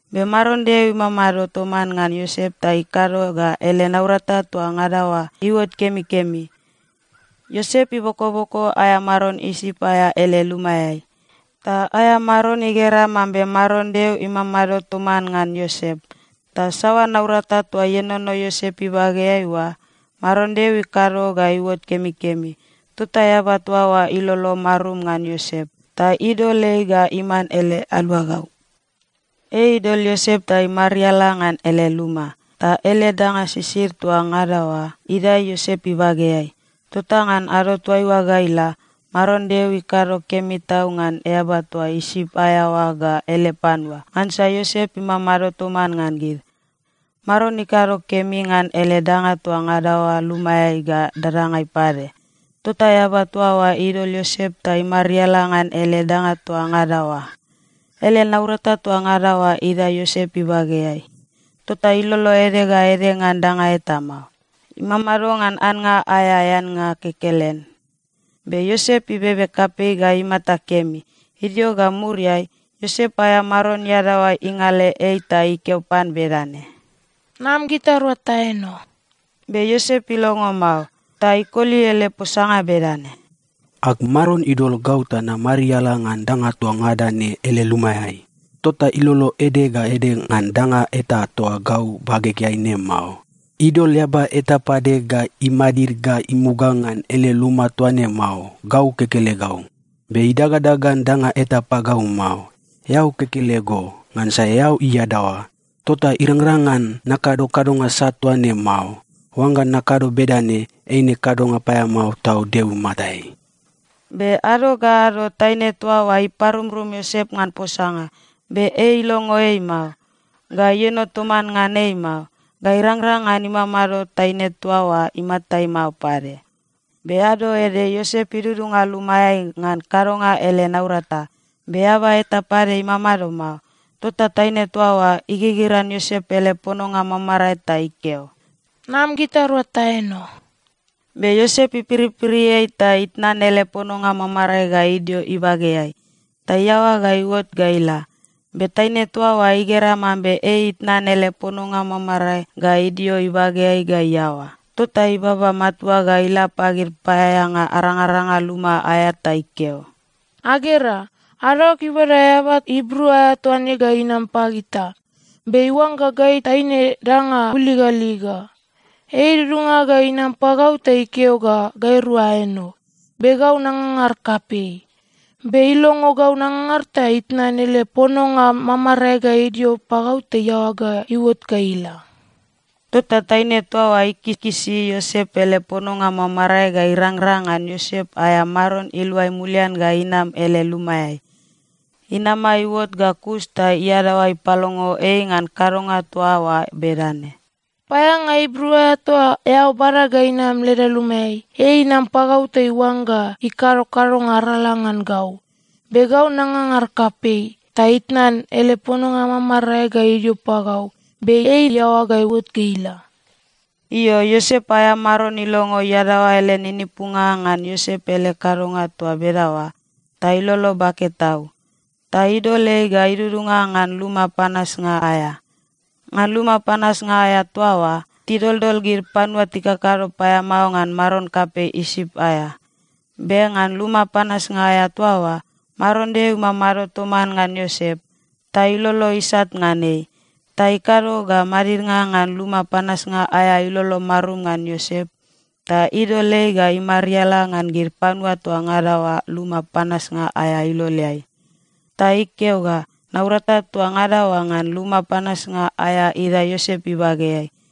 Be Maron Deo imamado toman ngan Iosep ta ikado ga ele naurata toa ngada oa iuot kemikemi. Iosep ibokoboko aea maron Isip aea ele lumaeai, ta aea maron igera mambe Maron Deo imamado toman ngan Iosep, ta saoa naurata toa ienono Iosep ibageai oa, Maron Deo ikado ga iuot kemikemi. Tota eaba toa oa ilolo marum ngan Iosep, ta idol ei ga iman ele aluagau. Ei idol Iosep ta imariala ngan ele luma, ta ele danga sisid toa ngada oa idae Iosep ibageai. Tota ngan ado toaiua ga ila, Maron Deo ikado kemi tau ngan eaba toa Isip aea oa ga ele panua, ngansa Iosep imamado toman ngan gid. Maron ikado kemi ngan ele danga toa ngada oa lumaeai ga dadangai pade. Tota eaba toa oa idol Iosep ta imariala ngan ele danga toa ngada oa. Ele naurata toa ngada oa idae Iosep ibageai, tota ilolo ede ga ede ngan danga eta mao. Imamado ngan annga aea eannga kekelen. Be Iosep ibebe kapei ga imata kemi. Idio ga muriai, Iosep aea maron iadaoa ingale ei ta ikeo pan bedane, “Nam gitarua taeno.” Be Iosep ilongo mao, ta ikoli ele posanga bedane, “Ag maron idol gau ta namariala ngan danga toa ngada ne ele lumaeai. Tota ilolo ede ga ede ngan danga eta toa gau bagegeai ne mao. Idol eaba eta pade ga imadid ga imuga ngan ele luma toa ne mao, gau kekelegau. Be idangadangan danga eta pagau mao, eao kekelego, ngansa eao iadaoa. Tota irangrang ngan nakado kadonga sat toa ne mao. Oangga nakado bedane, eine kadonga paeamao tau Deo imatai.” Be ado ga ado taine toa oa iparumrum Iosep ngan posanga, be ei ilongo ei mao, ga ieno toman ngan ei mao, ga irangrang ngan imamado taine toa oa imatai mao pade. Be ado ede, Iosep idudunga lumaeai ngan kadonga ele naurata, be eaba eta pade imamado mao. Tota taine toa oa igigiran Iosep ele pononga mamarae ta ikeo, “Nam gitarua taeno!” Be Iosep ipiripiri ei ta itnan ele pononga mamarae ga idio ibageai, ta iaoa ga iuot ga ila. Be taine toa oa igera mambe ei itnan ele pononga mamarae ga idio ibageai ga iaoa, tota ibaba matua ga ila pagid paeaeanga arangaranga luma aea ta ikeo, “Agera! Adaoag ibada eaba Ibru aea toa ne ga inam pagita, be iuangga gai taine danga buligaliga! Ei idudunga ga inam pagau ta ikeo ga gairua aeno, be gau nangangar kapei. Be ilongo gau nangangar ta itnan ele pononga mamarae ga idio pagau ta iaoa ga iuot ga ila.” Tota taine toa oa ikikisi Iosep ele pononga mamarae ga irangrang ngan Iosep aea maron iluai mulian ga inam ele lumaeai. Inama iuot ga kus ta iadaoa ipalongo ei ngan kadonga toa oa bedane, “Paeaeanga Ibru aea toa eao bada ga inam leda lumaeai, ei inam pagau ta iuangga ikado kadonga arala ngan gau. Be gau nangangar kapei, ta itnan ele pononga mamarae ga idio pagau, be ei iaoa ga iuot ga ila.” Io, Iosep aea maron ilongo iadaoa ele ninipunga ngan Iosep ele kadonga toa bedaoa, ta ilolo bake tau. Ta idol ei ga idudunga ngan luma panasnga aea. Ngan luma panasnga aea toa oa, tidoldol gid panua tikakado paeamao ngan maron kapei Isip aea. Be ngan luma panasnga aea toa oa, Maron Deo imamado toman ngan Iosep, ta ilolo isat ngan ei. Ta ikado ga madidnga ngan luma panasnga aea ilolo marum ngan Iosep ta idol ei ga imariala ngan gid panua toa ngada oa luma panasnga aea iloleai. Ta ikeo ga naurata toa ngada oa ngan luma panasnga aea idae Iosep ibageai.